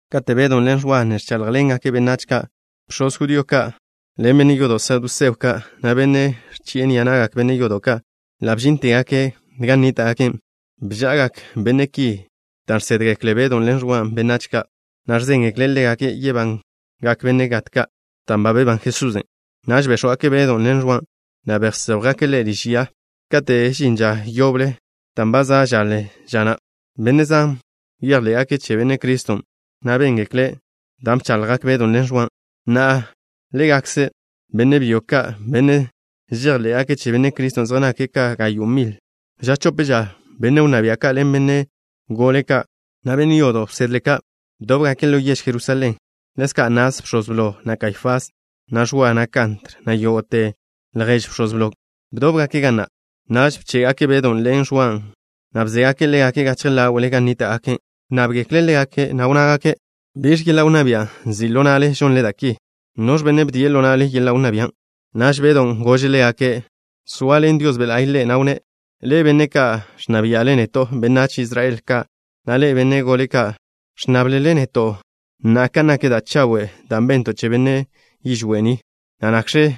Kate' Bedw ḻen Ẕwa ne ẕcháḻjḻengake' benách ka', bx̱oz judío ka' ḻen benne' yodo' saduseo ka', na' benne' ẕchi'e ni'a na'gak benne' yodo' ka', ḻa' bžíntegake' gan nníta'gake'. Bža'agak benne' ki dan' žsédgekle Bedon' ḻen Ẕwan' benách ka', na' ẕzéngekle' ḻégake' yebangak benne' gat ka' dan' ba bebán Jesusen'. Naž béx̱wgake' Bedon' ḻen Ẕwan', na' bséjwgake' ḻégake' liž ya kate' žinže ža yoble dan' ba za' žaḻe ža na'. Benne' zan bejḻé'gake' che Benne' Criston' dan' béngekle' da' bchaḻjgak Bedon' ḻen Ẕwan'. Na'a, ḻégakze benne' byo ka', benne' žejḻé'gake' che Benne' Criston' zej nake' ka gayo' mile'. Ža chope ža benne' wnná bia' ka' ḻen benne' gole ka', na' benne' yodo' wsedle ka', bdóbgake' ḻo yež Jerusalén. Ḻezka' Anás, bx̱oz blo, na' Kaifás, na' Ẕwa, na' Kantr, na' yógo'te ljež bx̱oz blon', bdóbgake' ga na'. Naž bché'gake' Bedon' ḻen Ẕwan', na' bzégake' ḻégake' gachje ḻáwe'le gan nníta'gake'. Wnnábgekle' ḻégake', na' wnnágake': —¿Biẕ yeḻa' wnná bia' nzi' ḻo na'le žonle da' ki? ¿Noẕ benne' bdie' ḻo na'le yeḻa' wnná bian'? Naž Bedon' gože' ḻégake', zoaḻen Dios Be' La'y ḻe', na' wnné': —Ḻe'e, benne' ka' ẕnna bia'le neto', benách Israel ka', na' ḻe'e, benne' gole ka'. ¿Ẕnnáblele neto' na'a kan nak da' chawe' da' bento' che benne' yižwé' ni, na' nakx̱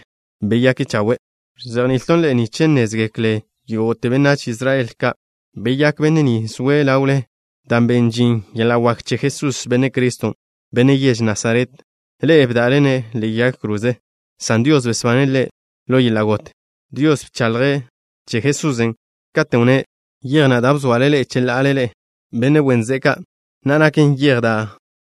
beyake' chawe'? Ẕzejni'ilton' ḻe'e nich nnézgeklen yógo'te benách Israel ka'. Beyák benne' ni zoe' ḻawle dan' ben žin yeḻa' wak che Jesús, Benne' Criston', Benne' yež Nasaret. Ḻe'e bda'le-ne' ḻe'e yag kroze, san Dios besbane' Ḻe' ḻo yeḻa' got. Dios bchaḻje' che Jesusen', katen' wnné': “Yej na' da' bzoale ḻe'e cheḻa'ale, ḻe'e, benne' wen ze'e ka', na'a naken yej da'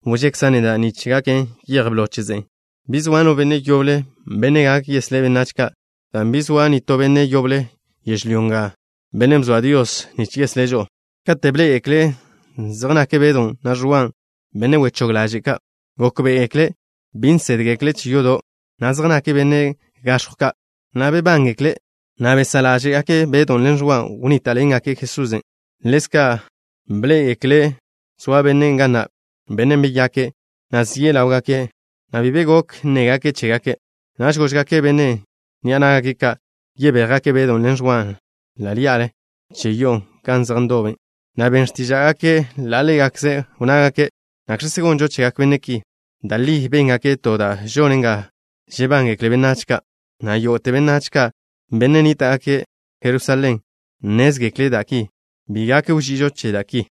wžekza' neda' nich gaken yej blo che ze'e.” Bi zoa no benne' yoble, benne' gak yeslé' benách ka', dan' bi zoa nitó benne' yoble yežlyó nga, bennen' bzoa Dios, nich yeslé' žo'o. Kate' bḻé'egekle' zej nak Bedon', na' Ẕwan', benne' wechóg ḻaže' ka', gókbe'egekle' bi nsédgekle' che yodo', na' zej nake' benne' gaẕjw ka', na' bebángekle', na' besá' ḻáže'gake' Bedon' ḻen Ẕwan' wnníta'ḻengake' Jesusen'. Ḻezka' bḻé'egekle' zoa bennen' ga na', bennen' beyake', na' zie' ḻáwgake', na' bi be gok nnégake' chégake'. Naž góžgake' benne' ni'a ná'gake' ka' yebéjgake' Bedon' ḻen Ẕwan' ḻí'ale che yo'o gan zej ndobe', na' ben x̱tíža'gake' ḻa' ḻégakze'. Wnnágake': —¿Nakx̱kzen' gonžo chegak benne' ki? Da' li béngake' to da' žonen ga žebángekle benách ka', na' yógo'te benách ka', benne' nníta'gake' Jerusalén, nnézgekle' da' ki. Bi gak wži'ižo che da' ki.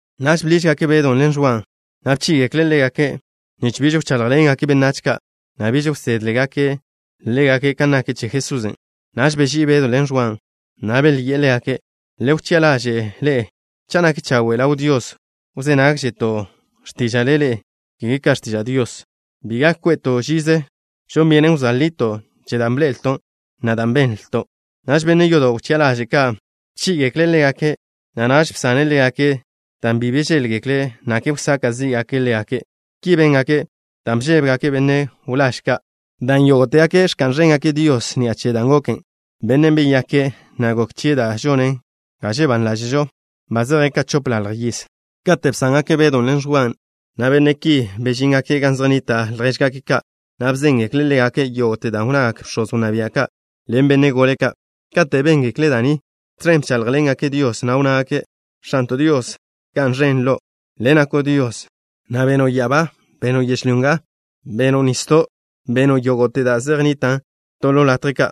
Naž bḻížgake' Bedon' ḻen Ẕwan', na' bchí'igekle' ḻégake' nich biž wcháḻjḻengake' benách ka', na' biž wsédgekle' ḻégake' kan nak che Jesusen'. Naž beží'i Bedon' ḻen Ẕwan', na' belyi'e ḻégake': —Le wchi'a ḻaže' ḻe'e cha' nak chawe' ḻaw Dios wzé nágžeto' x̱tíža'le ḻe'e ka x̱tiža' Dios. Bi gak kwe'to' žize. Žon byenen wzóa lito' che da' bḻe'elto', na' da' benlto'. Naž benne' yodo' wchi'a ḻaže' ka' bchí'igekle' ḻégake', na' naž bsane' ḻégake' dan' bi bžéḻgekle' nakle wsaka' zí'gake' ḻégake'. Ki béngake' dan' bžébegake' benne' wláž ka', dan' yógo'tegake' ẕka'n ẕéngake' Dios ni'a che dan' goken. Bennen' beyake', na' gok chie' da' žonen ga žebán ḻáže'žo, ba zeje' ka chopḻalj yiz. Kate' bsángake' Bedon' ḻen Ẕwan', na' benne' ki bežíngake' gan zej nnita' ljéžgake' ka', na' bzéngekle' ḻégake' yógo'te da' wnnagak bx̱oz wnná bia' ka' ḻen benne' gole ka'. Kate' béngekle' da' ni, tẕen bcháḻjḻengake' Dios, na' wnnágake': —¡X̱anto' Dios, ga'n ẕen Lo'! Le' nako' Dios, na' beno' ya'abá. Beno' yežlyó nga. Beno' nisdo'. Beno' yógo'te da' zej nnitan' to to latje ka'.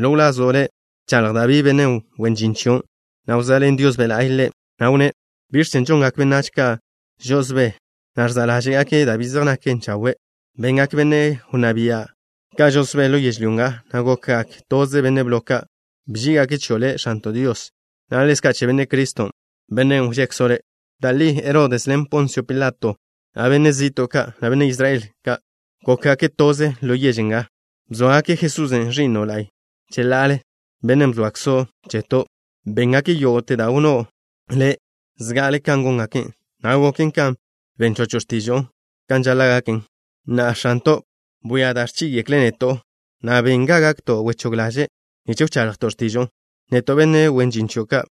Ḻo wlazo' Le' bchaḻj Dabí, benne' wen žin chion', na' wzoaḻen Dios Be' La'y ḻe', na' wnné': ¿Biẕ chen' žongak benách ka' žo'osbé, na' ẕza' ḻáže'gake' da' bi zej naken chawe'? Bengak benne' wnná bia' ka' žo'osbé ḻo yežlyó nga, na' gokgak toze benne' blo ka'. Bží'igake' chio' Le', X̱anto' Dios, na' ḻezka' che Benne' Criston', Bennen' wžekzo' Le'. ’Da' li Herodes ḻen Ponsio Pilato, na' benne' zi'to' ka', na' benne' Israel ka', gókgake' toze ḻo yež nga. Bzóagake' Jesús, Ẕi'no' la'y, cheḻa'ale, Bennen' bzoakzo' cheto'. Béngake' yógo'te da' wnnó' Le' zga'ale kan góngake', na' goken kan ben chocho' x̱tižo'o kan žaḻa' gaken. Na'a, X̱anto', bwia da' ẕchí'igekle' neto', na' ben ga gakto' wechóg ḻaže', nich wchaḻjto' x̱tižo'o, neto' benne' wen žin chio' ka'.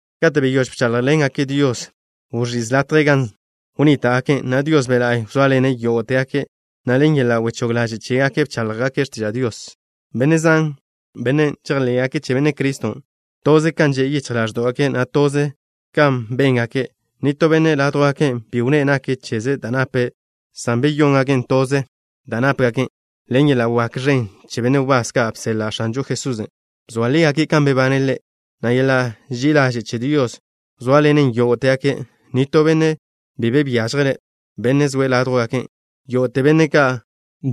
Kate' beyóž bcháḻjḻengake' Dios, wẕíz latjen' gan wnníta'gake', na' Dios Be' La'y wzóaḻene' yógo'tegake', na' ḻen yeḻa' wechóg ḻaže' chégake' bcháḻjgake' x̱tiža' Dios. Benne' zan, benne' žejḻé'gake' che Benne' Criston', toze kan že' yichj ḻáẕdo'gake', na' toze kan béngake'. Nitó benne' ládjwgake' bi wnné' nak cheze' da' nape', san beyóngake' toze da' nápegake'. Ḻen yeḻa' wak ẕen, benne' wbás ka' bseḻa' X̱anžo Jesusen', bzoa lígake' kan bebane' Ḻe', na' yeḻa' ži'i ḻaže' che Dios wzóaḻenen yógo'tegake'. Nitó benne' bi be byážjele', benne' zoe' ládjwgake'. Yógo'te benne' ka'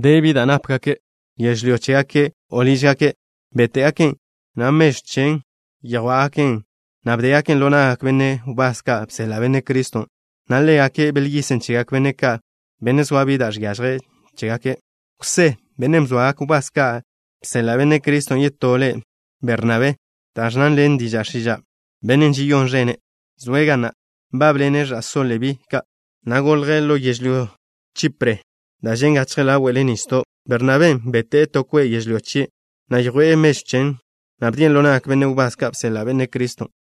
zoa bi da' nápegake', yežlyó chégake', o lížgake', béte'gaken', na' mežw chen yjwá'gaken', na' bdégaken' ḻo na'gak benne' wbás ka' bseḻa' Benne' Criston', na' ḻégake' belyisen' chegak benne' ka', benne' zoa bi da' žiažjen chégake'. Jwsé, bennen' bzoagak wbás ka' bseḻa' Benne' Criston' yetó le', Bernabé, da' ẕnnan ḻen diža' x̱iža', Benne' Žeyón Ẕene', zoe' ga na'. Nbábḻene' ẕa'só Lebí ka', na' golje' ḻo yežlyó Chipre, da' žen' gachje ḻáwe'le nisdo'. Bernabén' bete'e to kwe' yežlyó chie', na' yjwe' mežw chen, na' bdien' ḻo na'gak benne' wbás ka' bseḻa' Benne' Criston'.